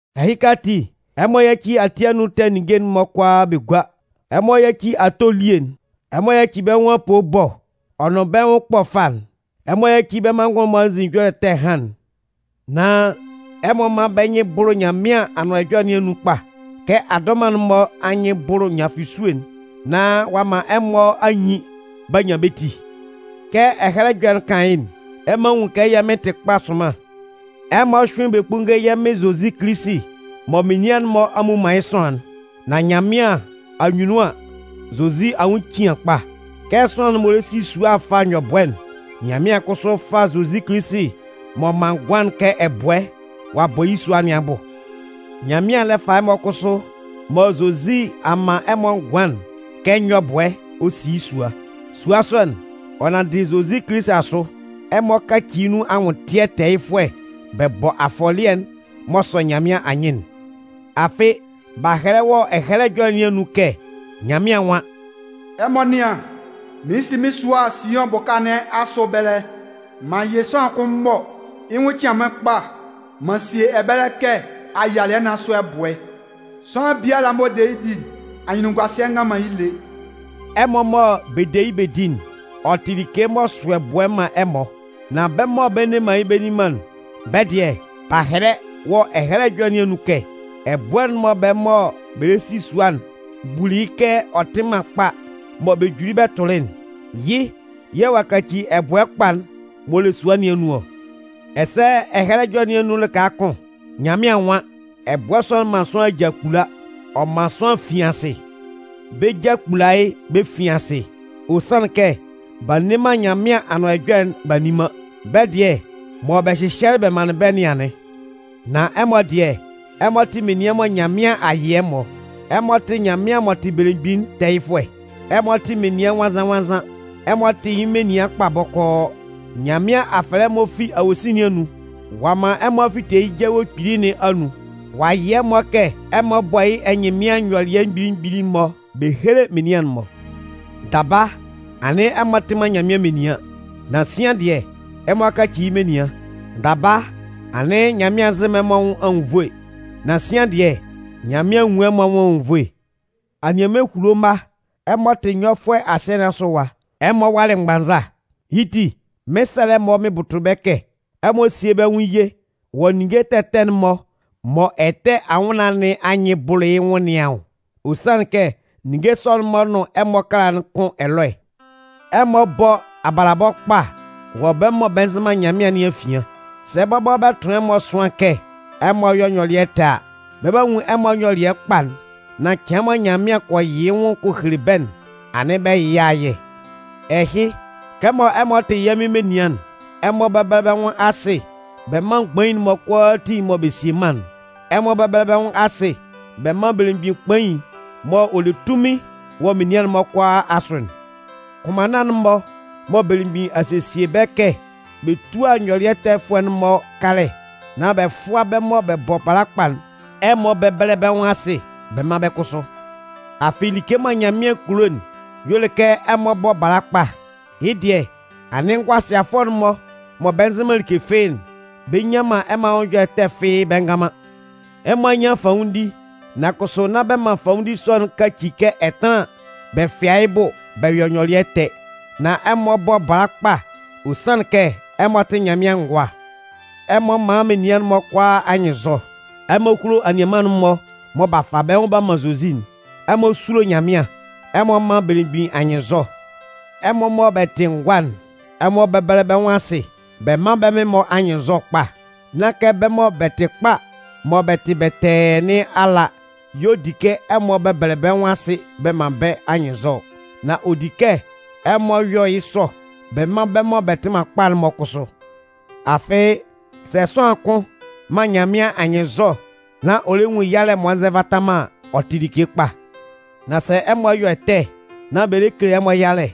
Ɛhɩka ati, ɛmɔ yáci ati anun ɛtɛ ninnge'n-mɔ kʋalaa bɛ gúa. Ɛmɔ yáci ato elie'n. Ɛmɔ yáci bɛ́ nwʋn apoo ɛbɔ ɔ nʋn bɛ́ nwʋn ɛkpɔ ɛfa'n. Ɛmɔ yáci bɛ́ manngʋn'n-mɔ anzin ɛjɔlɛ ɛtɛ ɛhan'n. Nan ɛmɔ mán bɛ́ nyɩn bʋ́lʋ Nyanmɩan Anʋan Ɛjɔlɛ nɩn anun kpa kɛ adɔman'n-mɔ anyɩn bʋlʋ nyafʋsue'n nán ɔ'a man ɛmɔ a nyin b'a nyan bɛ́ ti. Kɛ Ɛhɛlɛ Ɛjɔlɛ'n kan yɩ́'n: Ɛmɔ a nwun kɛ yɛ̂ Mɩn tɩ kpa sʋnman. Ɛmɔ hyʋ́ɩn bɛ kpúnnge yɛ́ Mɩn Zozi Kilisi mɔ menian'n-mɔ a mmu man yɩ́ sʋanlan'n. Nan Nyanmɩan anyunnun an, Zozi anwʋn cian kpa. Kɛ sʋanlan m'ɔ lɛ si sua fa nyɔbʋɛ'n, Nyanmɩan kʋsʋ a fa Zozi Kilisi m'ɔ man ngʋan'n kɛ ɛbʋɛ, ɔ a bɔ yɩ́ sua nɩn abʋ. Nyanmɩan lɛ fa ɛmɔ kʋsʋ mɔ Zozi a man ɛmɔ ngʋan'n kɛ nyɔbʋɛ ɔ si yɩ́ sua. Sua sɔ'n, ɔ nanndɩ Zozi Kilisi asʋ, ɛmɔ 'kaci nun anwʋntɩɛ tɛɛyɩfʋɛ bɛ bɔ afɔlɩɛ'n m'ɔ sɔ Nyanmɩan anyɩn'n. Afɩ b'a hɛlɛ wɔ Ɛhɛlɛ Ɛjɔlɛ nɩn anun kɛ Nyanmɩan nwan: Ɛmɔ nɩ́an, mɩɩn si mɩ́n sua'n Siʋn bʋka nɩn asʋ ɛbɛlɛ. M'an yɩ sʋanlan kʋn mɔ yɩ́ nwʋn cian mɩ́n kpa m'an sie ɛbɛlɛ kɛ ayialɩɛ nɩn asʋ ɛbʋɛ'n. Sʋanlan biala m'ɔ de yɩ́ di'n, anyunnunguasɩɛ ngan man yɩ́ lé. Ɛmɔ mɔ bɛ de yɩ́ bɛ di'n, ɔ tɩ like m'ɔ sʋ ɛbʋɛ man ɛmɔ. Nan bɛ́ mɔ bɛ nne man yɩ́ bɛ nni man'n, bɛ́ dɩɛ, b'a hɛlɛ wɔ Ɛhɛlɛ Ɛjɔlɛ nɩn anun kɛ: Ɛbʋɛ'n mɔ bɛ́ mɔ bɛ lɛ si sua'n buli yɩ́ kɛ ɔ tɩ man kpa mɔ bɛ juli bɛ tʋlɩ'n, yɩ́ yɛ̂ ɔ'a kaci ɛbʋɛ kpa'n m'ɔ le sua nɩn anun ɔ. Ɛsɛ Ɛhɛlɛ Ɛjɔlɛ nɩn anun lɩka kʋn, Nyanmɩan nwan: Ɛbʋɛ sɔ'n man sʋanlan aja kpula, ɔ man sʋanlan fin asɩ. Bɛ́ ja kpula yɩ́ bɛ fin asɩ, ɔ sanlɩn kɛ b'a nne man Nyanmɩan Anʋan Ɛjɔlɛ'n b'a nni man. Bɛ́ dɩɛ mɔ bɛ hyɩhyɛlɩ bɛ manlɩn bɛ́ nɩn anɩn. Nan ɛmɔ dɩɛ, ɛmɔ tɩ menian mɔ Nyanmɩan a yɩ ɛmɔ. Ɛmɔ tɩ Nyanmɩan m'ɔ tɩ belemgbin'n tɛɛyɩfʋɛ, ɛmɔ tɩ menian nwannzan-nwannzan, ɛmɔ tɩ yɩ́ menian kpa bɔkɔɔ. Nyanmɩan a fɛlɛ ɛmɔ fi awosin nɩn anun, ɔ'a man ɛmɔ a fite yɩ́ jawe kpili nɩn anun. Ɔ'a yɩ ɛmɔ kɛ ɛmɔ bɔ́ yɩ́ ɛnyɩnman nyɔlɩɛ mgbili mgbili'n-mɔ bɛ héle menian'n-mɔ. Daba anɩn ɛmɔ tɩ man Nyanmɩan menian. Nan sian dɩɛ, ɛmɔ a kaci yɩ́ menian. Daba anɩn Nyanmɩan nzɩ man ɛmɔ anwʋn anwunnvoe, nan sian dɩɛ, Nyanmɩan a nwun ɛmɔ anwʋn anwunnvoe. Anianman ehulo mma, ɛmɔ tɩ nyɔfʋɛ asɩɛ nɩn asʋ ɛwa. Ɛmɔ walɩ mgbannza. Yɩ́ ti, mɩn 'sɛlɛ ɛmɔ mɩn bʋtʋ bɛ́ kɛ ɛmɔ síe bɛ́ nwʋn ye wɔ ninnge ɛtɛ ɛtɛ'n-mɔ mɔ ɛtɛ anwʋnnaan nɩn anyɩn bʋlʋ yɩ́ nwʋn nɩn anwʋn. Ɔ sanlɩn kɛ ninnge sɔ'n-mɔ nʋn ɛmɔ ɛkala'n kʋn ɛlɔɛ. Ɛmɔ bɔ́ abalabɔ kpa wɔ bɛ́ mɔ bɛ nzɩ man Nyanmɩan nɩn afian. Sɛ bɔbɔ bɛ tʋn ɛmɔ ɛsʋan kɛ ɛmɔ yɔ nyɔlɩɛ ɛtɛ a, bɛ 'ba nwun ɛmɔ nyɔlɩɛ kpa'n, nán cɩan mɔ Nyanmɩan kɔ yɩ yɩ́ nwʋn kɔ hele bɛ́'n, anɩn bɛ yɩ yɩ́ ayɛ. Ɛhɩ, kɛmɔ ɛmɔ tɩ yɛ́ Mɩn menian'n, ɛmɔ bɛ́bɛlɛ bɛ́ nwʋn asɩ bɛ mán mgbain'n-mɔ kʋalaatin mɔ bɛ sie mân'n. Ɛmɔ bɛ́bɛlɛ bɛ́ nwʋn asɩ bɛ mán belemgbin kpain'n m'ɔ le tunmin wɔ menian'n-mɔ kʋalaa asʋ'n. Kʋnmanna'n-mɔ mɔ belemgbin a sesie bɛ́ kɛ bɛ túa nyɔlɩɛtɛfʋɛ'n-mɔ kalɛ nán bɛ fʋ́a bɛ́ mɔ bɛ bɔ bala kpa'n, ɛmɔ bɛ́bɛlɛ bɛ́ nwʋn asɩ bɛ mán bɛ́ kʋsʋ. Afɩ like mɔ Nyanmɩan kulo'n y'ɔ le kɛ ɛmɔ bɔ́ bala kpa. Yɩ́ dɩɛ, anɩn ngʋasɩafʋɛ'n-mɔ mɔ bɛ nzɩ man like fɩ́ɩ́'n, bɛ nnyan man ɛmɔ anwʋn ɛjɔlɛ ɛtɛ fɩ́ɩ́ bɛ ngan man. Ɛmɔ a nyan fanwʋndi, nan kʋsʋ nán bɛ man fanwʋndi sɔ'n kaci kɛ ɛtanlan bɛ fɩa yɩ́ bʋ bɛ yɔ nyɔlɩɛ ɛtɛ. Nan ɛmɔ bɔ́ bala kpa, ɔ sanlɩn kɛ ɛmɔ tɩ Nyanmɩan ngʋa. Ɛmɔ mán menian'n-mɔ kʋalaa anyɩnnzɔ. Ɛmɔ húlo anianman'n-mɔ mɔ b'a fa bɛ́ nwʋn b'a man Zozi'n. Ɛmɔ súlo Nyanmɩan, ɛmɔ mán belemgbin anyɩnnzɔ. Ɛmɔ mɔ bɛ tɩ ngʋa'n, ɛmɔ bɛ́bɛlɛ bɛ́ nwʋn asɩ, bɛ mán bɛ́ mɩn-mɔ anyɩnnzɔ kpa. Nán kɛ bɛ́ mɔ bɛ tɩ kpa mɔ bɛ tɩ bɛtɛɛ nɩn ala y'ɔ di kɛ ɛmɔ bɛbɛlɛ bɛ́ nwʋn asɩ bɛ man bɛ́ anyɩnnzɔ ɔ. Nan ɔ di kɛ ɛmɔ yɔ yɩ́ sɔ bɛ man bɛ́ mɔ bɛ tɩ man kpa'n-mɔ kʋsʋ. Afɩ sɛ sʋanlan kʋn man Nyanmɩan anyɩnnzɔ nán ɔ lɛ nwun yalɛ m'ɔ nzɛ nvata man an, ɔ tɩ like kpa. Nan sɛ ɛmɔ yɔ ɛtɛ nán bɛ lɛ kele ɛmɔ yalɛ,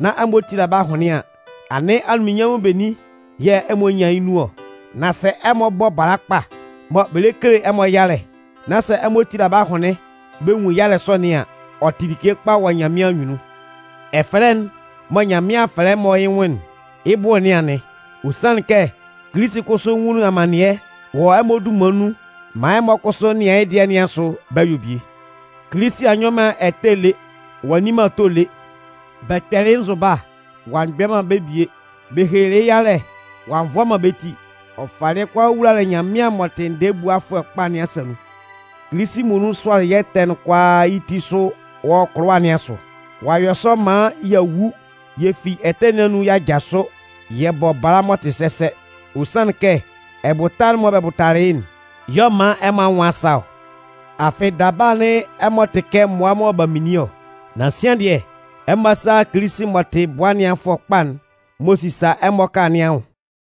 nán ɛmɔ tila bɛ́ ahʋnlɩn an, anɩn anunminnyanmʋn benin yɛ̂ ɛmɔ nyan yɩ́ nun ɔ? Nan sɛ ɛmɔ bɔ bala kpa, mɔ bɛ lɛ kele ɛmɔ yalɛ, nán sɛ ɛmɔ tila bɛ́ ahʋnlɩn bɛ nwun yalɛ sɔ nɩn an, ɔ tɩ like kpa wɔ Nyanmɩan anyunnun. Ɛfɛlɛ'n mɔ Nyanmɩan a fɛlɛ ɛmɔ yɩ́ nwʋn'n, yɩ́ bʋ nɩn anɩn. Ɔ sanlɩn kɛ Kilisi kʋsʋ nwunlin amannɩɛ wɔ ɛmɔ dunman nun maan ɛmɔ kʋsʋ nɩan yɩ́ dɩɛ nɩn asʋ bɛ yɔ bie. Kilisi a nyɔ man ɛtɛ lé, ɔ'a nni man ato lé. Bɛ kpɛlɩ yɩ́ nzʋba, ɔ'a mgbɛ man bɛ́ bie. Bɛ helelɩ yɩ́ yalɛ, ɔ'a nvʋa man bɛ́ ti. Ɔ falɩ yɩ́ kʋalaa wulalɩ Nyanmɩan m'ɔ tɩ ndɛɛbuafʋɛ kpa nɩn asa nun. Kilisi muonun sʋalɩ yɛ́ ɛtɛ'n kʋalaa yɩ́ ti sʋ wɔ kʋlʋwa nɩn asʋ. Ɔ'a yɔ sɔ maan y'a wu yɛ fi ɛtɛ nɩn anun y'a jasʋ yɛ bɔ bala m'ɔ tɩ sɛsɛ. Ɔ sanlɩn kɛ, ɛbʋta'n mɔ bɛ bʋtalɩ yɩ́'n y'ɔ man ɛmɔ anwʋn a sa ɔ. Afɩ daba anɩn ɛmɔ tɩ kɛ mmʋa mɔ b'a minlin ɔ. Nan sian dɩɛ, ɛmɔ a sa a a Kilisi m'ɔ tɩ bʋa ɛnɩanfʋɛ kpa'n m'ɔ sisa ɛmɔ ɛkala nɩn anwʋn.